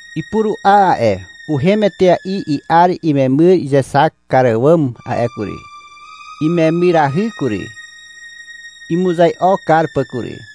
Ipuru'a a'e. Uhem etea'i i'ar imemyr izexak kar àwàm a'e kury. Imemyrahy kury, imuzai'o kar pà kury.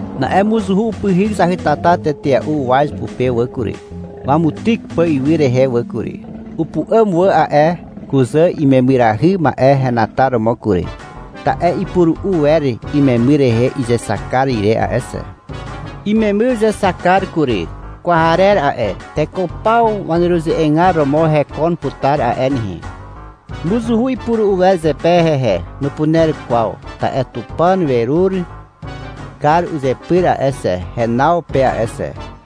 Na'e mozuhu upyhyk zahytata tetea'u uwaz pupe wà kury, wamutyk pà ywy rehe wà kury. Upu'àm wà a'e kuzà imemyrahy ma'e henataromo kury, ta'e ipuru'u wer imemyr rehe izexak kar ire a'e xe. Imemyr uzexak kar kury. Kwarer a'e. Teko paw waneruze'egar romo hekon putar a'e nehe. Mozuhu ipuru'u wer zepe hehe. Nupuner kwaw, ta'e Tupàn werur kar uzepyr a'e xe, henaw pe a'e xe.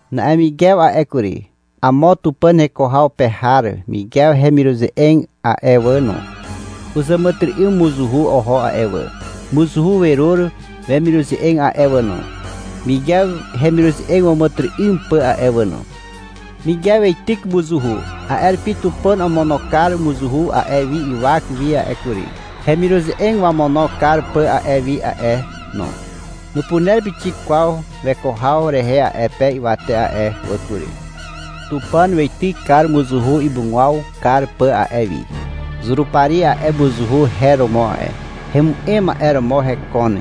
Na'e Migew a'e kury, amo Tupàn heko haw pe har Migew hemiruze'eg a'e wà no, uzàmàtyry'ym mozuhu oho a'e wà. Mozuhu werur wemiruze'eg a'e wà no, Migew hemiruze'eg wàmàtyry'ym pà a'e wà no. Migew weityk mozuhu. A'e rupi Tupàn omono kar mozuhu a'e wi ywak wi a'e kury, hemiruze'eg wamono kar pà a'e wi a'e no. Nupuner pixik kwaw weko haw rehe a'e pe ywate a'e wà kury. Tupàn weityk kar mozuhu imugwaw kar pà a'e wi. Zurupari a'e mozuhu her romo a'e. Hemu'em ma'e romo hekon.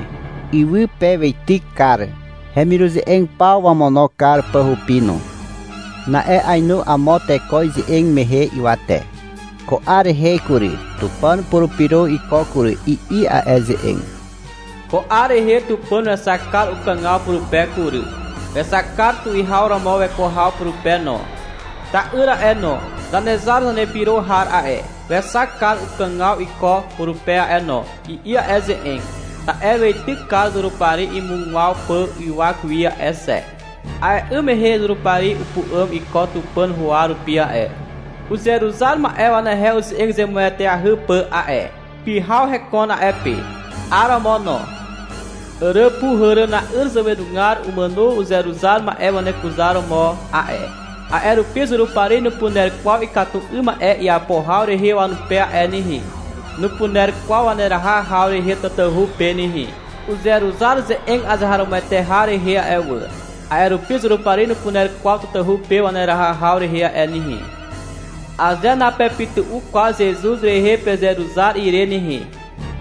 Ywy pe weityk kar, hemiruze'eg paw wamono kar pà hupi no. Na'e ainu amo teko ize'eg mehe ywate. — Ko 'ar rehe kury, Tupàn upurupyro iko kury, i'i a'e ze'eg. — Ko 'ar rehe Tupàn wexak kar ukàgaw purupe kury. Wexak kar tuwihaw romo weko haw purupe no. Ta'yr a'e no, Zanezar Zanepyro har a'e, wexak kar ukàgaw iko purupe a'e no, i'i a'e ze'eg. — Ta'e weityk kar Zurupari imugwaw pà ywak wi a'e xe. A'e 'ym mehe Zurupari upu'àm iko Tupàn huwa rupi a'e, uzeruzar ma'e wanehe uze'eg zemueteahy pà a'e. Pyhaw hekon a'e pe. 'Aromo no. Àràpuhàràna'yr zàwenugar umàno uzeruzar ma'e wanekuzaromo a'e. A'e rupi Zurupari nupuner kwaw ikatu 'ym ma'e iapo haw rehe wanupe a'e nehe. Nupuner kwaw waneraha haw rehe tatahu pe nehe. Uzeruzar ze'eg azeharomoete har rehe a'e wà, a'e rupi Zurupari nupuner kwaw tatahu pe waneraha haw rehe a'e nehe. — Aze napepytu'u kwaw Zezuz rehe pezeruzar ire nehe,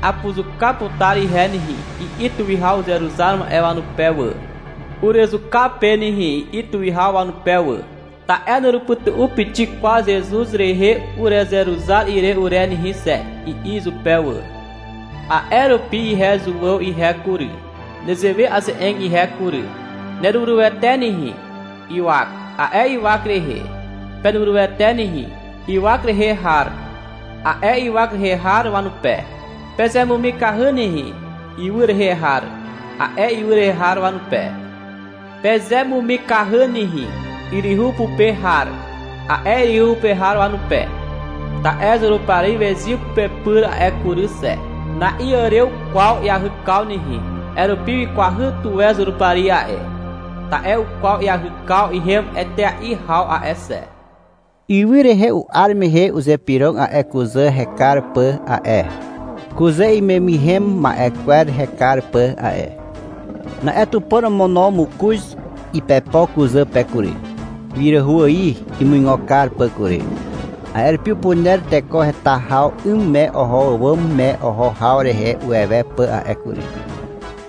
apuzuka putar ihe nehe, i'i tuwihaw uzeruzar ma'e wanupe wà, — Urezuka pe nehe, i'i tuwihaw wanupe wà. — Ta'e nurupytu'u pixik kwaw Zezuz rehe urezeruzar ire ure nehe xe, i'i izupe wà. A'e rupi ihe Zuàw ihe kury, nezewe aze'eg ihe kury. — Nerurywete nehe, ywak, a'e ywak rehe. — Penurywete nehe, ywak rehe har, a'e ywak rehe har wanupe. — Pezemumikahy nehe, ywy rehe har, a'e ywy rehe har wanupe. — Pezemumikahy nehe, yryhu pupe har, a'e yryhu pe har wanupe. Ta'e Zurupari wezyw pepyr a'e kury xe. Na'iàrew kwaw iahykaw nehe, a'e rupi wikwahy tuwe Zurupari a'e. Ta'e ukwaw iahykaw ihem etea'i haw a'e xe. Ywy rehe u'ar mehe uzypyrog a'e kuzà hekar pà a'e, kuzà imemyrhem ma'e kwer hekar pà a'e. Na'e Tupàn omono mokoz ipepo kuzà pe kury, wiràhu ài imuigo kar pà kury. A'e rupi upuner teko heta haw 'ym me oho àwàm me oho haw rehe uwewe pà a'e kury.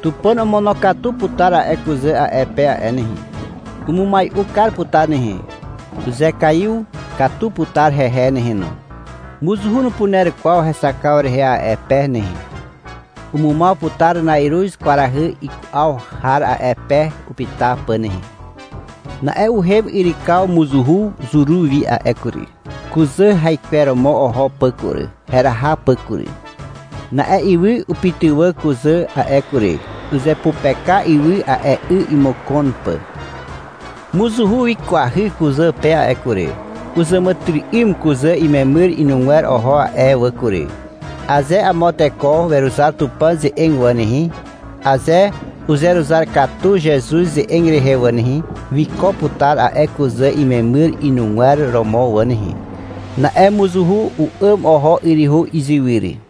Tupàn omonokatu putar a'e kuzà a'e pe a'e nehe. Umumai'u kar putar nehe. Uzekaiw katu putar hehe nehe no. Mozuhu nupuner kwaw hexakaw rehe a'e pe nehe. Umumaw putar na'iruz kwarahy iku'aw har a'e pe upyta pà nehe. Na'e uhem yrykaw mozuhu zuru wi a'e kury, kuzà raikweromo oho pà kury, heraha pà kury. Na'e ywy upytywà kuzà a'e kury. Uzepupeka ywy a'e 'y imokon pà. Mozuhu wikwahy kuzà pe a'e kury. Uzàmàtyry'ym kuzà imemyr inugwer oho a'e wà kury. Aze amo teko weruzar Tupàn ze'eg wà nehe, aze uzeruzar katu Zezuz ze'eg rehe wà nehe, wiko putar a'e kuzà imemyr inugwer romo wà nehe. Na'e mozuhu u'àm oho yryhu izywyr.